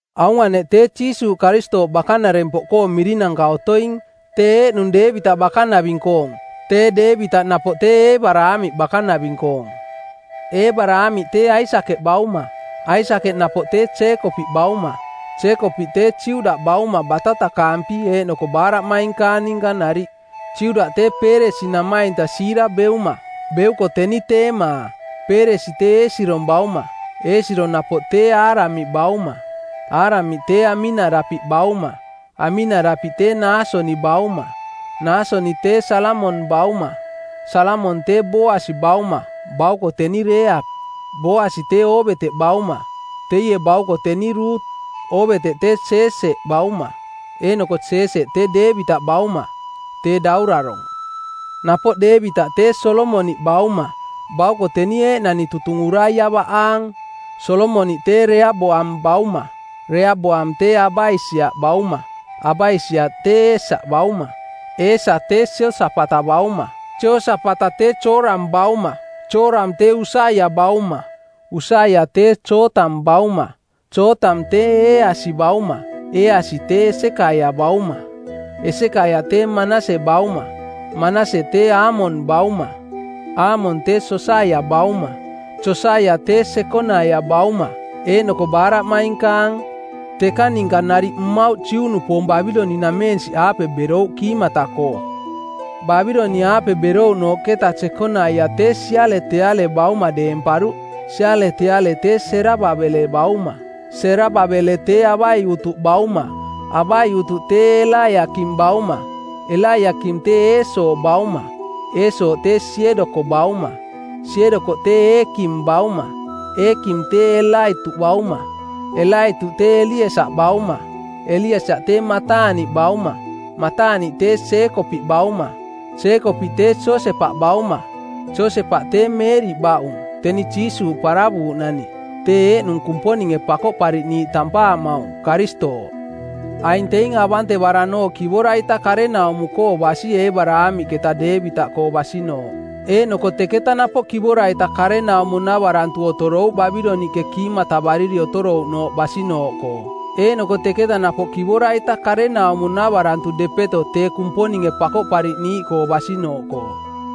Aung aneꞌ tee Jiisuuꞌ Karistooꞌ bakanarempoꞌkoong mirinanka otoing, tee eeꞌnung Deevitaꞌ bakanaving-koong, tee Deevitaꞌ napoꞌ tee Eebaraamiꞌ bakanaving-koong. Eebaraamiꞌ tee Aisakeꞌ bauma. Aisakeꞌ napoꞌ tee Jeekopiꞌ bauma. Jeekopiꞌ tee Juda bauma batatakaampi eeꞌnoko baaraꞌmainkaang ninka nariꞌ. Juda tee Peeresi namainta Siira beuma. Beuko teni Teemaa. Peeresi tee Eesirong bauma. Eesirong napoꞌ tee Aramiꞌ bauma. Aramiꞌ tee Aminadapiꞌ bauma. Aminadapiꞌ tee Naasoni bauma. Naasoni tee Salamong bauma. Salamong tee Booasi bauma, bauko teni Reeap. Booasi tee Oobeteꞌ bauma, teie bauko teni Rut. Oobeteꞌ tee Jeeseꞌ bauma. Eeꞌnoko Jeeseꞌ tee Deevitaꞌ bauma, tee daurarong˜. Napoꞌ Deevitaꞌ tee Solomoniꞌ bauma, bauko teni eeꞌnani tutung Uraia baꞌaang. Solomoniꞌ tee Reaboam bauma. Reaboam tee Abaisiaꞌ bauma. Abaisiaꞌ tee Eesa bauma. Eesa tee Jeosapata bauma. Jeosapata tee Jooram bauma. Jooram tee Usaia bauma. Usaia tee Jootam bauma. Jootam tee Eeasi bauma. Eeasi tee Esekaia bauma. Esekaia tee Manase bauma. Manase tee Aamon bauma. Aamon tee Josaia bauma. Josaia tee Jekonaia bauma, eeꞌnoko baaraꞌmainkaang. Tekang ninka nariꞌ mmauꞌ Juꞌnupoong Babiloniꞌnameensiꞌaape berouꞌ kiimata-koo. Babiloniꞌaape berouꞌnooꞌketa Jekonaia tee Sialeteale bauma deemparuꞌ. Sialeteale tee Serababele bauma. Serababele tee Abaiutuꞌ bauma. Abaiutuꞌ tee Elaiakim bauma. Elaiakim tee Eesoo bauma. Eesoo tee Siedoko bauma. Siedoko tee Eekim bauma. Eekim tee Elaituꞌ bauma. Elaituꞌ tee Eliesaꞌ bauma. Eliesaꞌ tee Mataaniꞌ bauma. Mataaniꞌ tee Jeekopiꞌ bauma. Jeekopiꞌ tee Josepaꞌ bauma. Josepaꞌ tee Meeriꞌ baꞌung, teni Jiisuuꞌ paravuuꞌnani, tee eeꞌnung Kumponinge Pakoꞌpariꞌniiꞌ tampaamaung, Karistooꞌ. Aing teing avantevaranooꞌ kivora-ita karenaumo-koo basi Eebaraamiꞌketa Deevitaꞌkoo basinooꞌ, eeꞌnoko teketa napoꞌ kivora-ita karenaumo-navarantu otorouꞌ Babiloniꞌke kiimatavariri otorouꞌnooꞌ basinooꞌkoo. Eeꞌnoko teketa napoꞌ kivora-ita karenaumo-navarantu depeto tee Kumponinge Pakoꞌpariꞌniiꞌkoo basinooꞌkoo.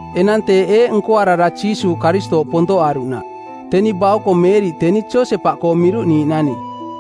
Enang teeꞌ eeꞌ nkoarara Jiisuuꞌ Karistooꞌ pontoꞌaruꞌnaꞌ. Teni bauko Meeriꞌ teni Josepaꞌkoo miruꞌniiꞌnani,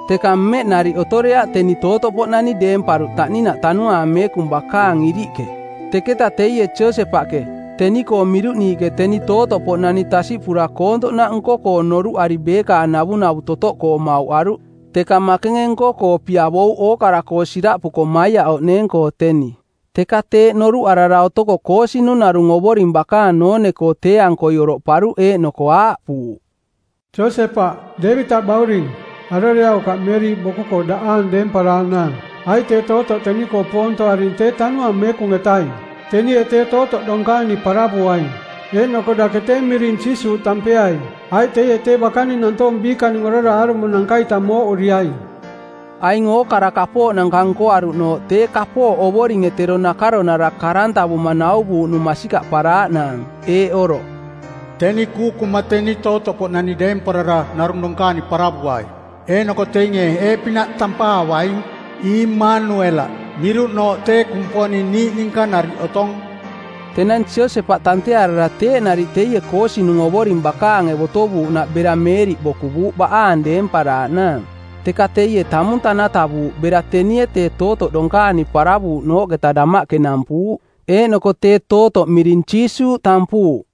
teka mmeꞌ nariꞌ otoreaꞌ teni tootoꞌpoꞌnani deemparuꞌ taꞌninaꞌ Tanuaang Meekung bakaang iriꞌke. Teketa teie Josepaꞌke, teni-koo miruꞌniiꞌke teni tootoꞌpoꞌnani tasiꞌpura koontoꞌnaꞌ nko-koo noruꞌari beekaang navunavu totoꞌkoo mauꞌaruꞌ, teka makenge nko-koo piavouꞌ ookara-koo siraꞌpuko maiaꞌoꞌneeng-koo teni. Teka teeꞌ noruꞌarara otoko koosinung˜ narung Ovoring bakaang noone-koo tee-ankoi oroꞌparuꞌ eeꞌnoko aaꞌpuuꞌ, “Josepaꞌ, Deevitaꞌ bauring, aroreaukaꞌ Meeriꞌ boku-koo daꞌaang deemparaaꞌnaang, aiꞌ tee tootoꞌ teni-koo poontoaring˜ tee Tanuaang Meekung-etaing. Tenie tee tootoꞌ donkaani paravuaing, eeꞌnoko dake tee miring Jiisuuꞌ tampeaing, aiꞌ teie tee bakaning nantoong biikaning orara aarumonanka-ita mooꞌuriaing.” Aing ookara kapooꞌnanka nkoaruꞌnooꞌ tee kapooꞌ Ovoringe tero nakaronara˜ karantavuma˜ nauvuuꞌnung masikaꞌparaaꞌnaang, eeꞌ oroꞌ: “Teni kuukuma˜ teni tootoꞌpoꞌnani deemparara narung donkaani paravuai, eeꞌnoko teinge eeꞌpinaꞌ tampaavaing, ‘Iimanuelaꞌ,’ miruꞌnooꞌ tee ‘Kumponing niiꞌ ninka nariꞌ otong.’” Tenang Josepaꞌ tantearara teeꞌ nariꞌ teie koosinunge Ovoring bakaange botovuuꞌnaꞌ bera Meeriꞌ bokuvuuꞌ baꞌaang deemparaaꞌnaang. Teka teie tamung tanatavuuꞌ bera tenie tee tootoꞌ donkaani paravuuꞌnooꞌketa damaꞌke nampuuꞌ. Eeꞌnoko tee tootoꞌ miring Jiisuuꞌ tampuuꞌ.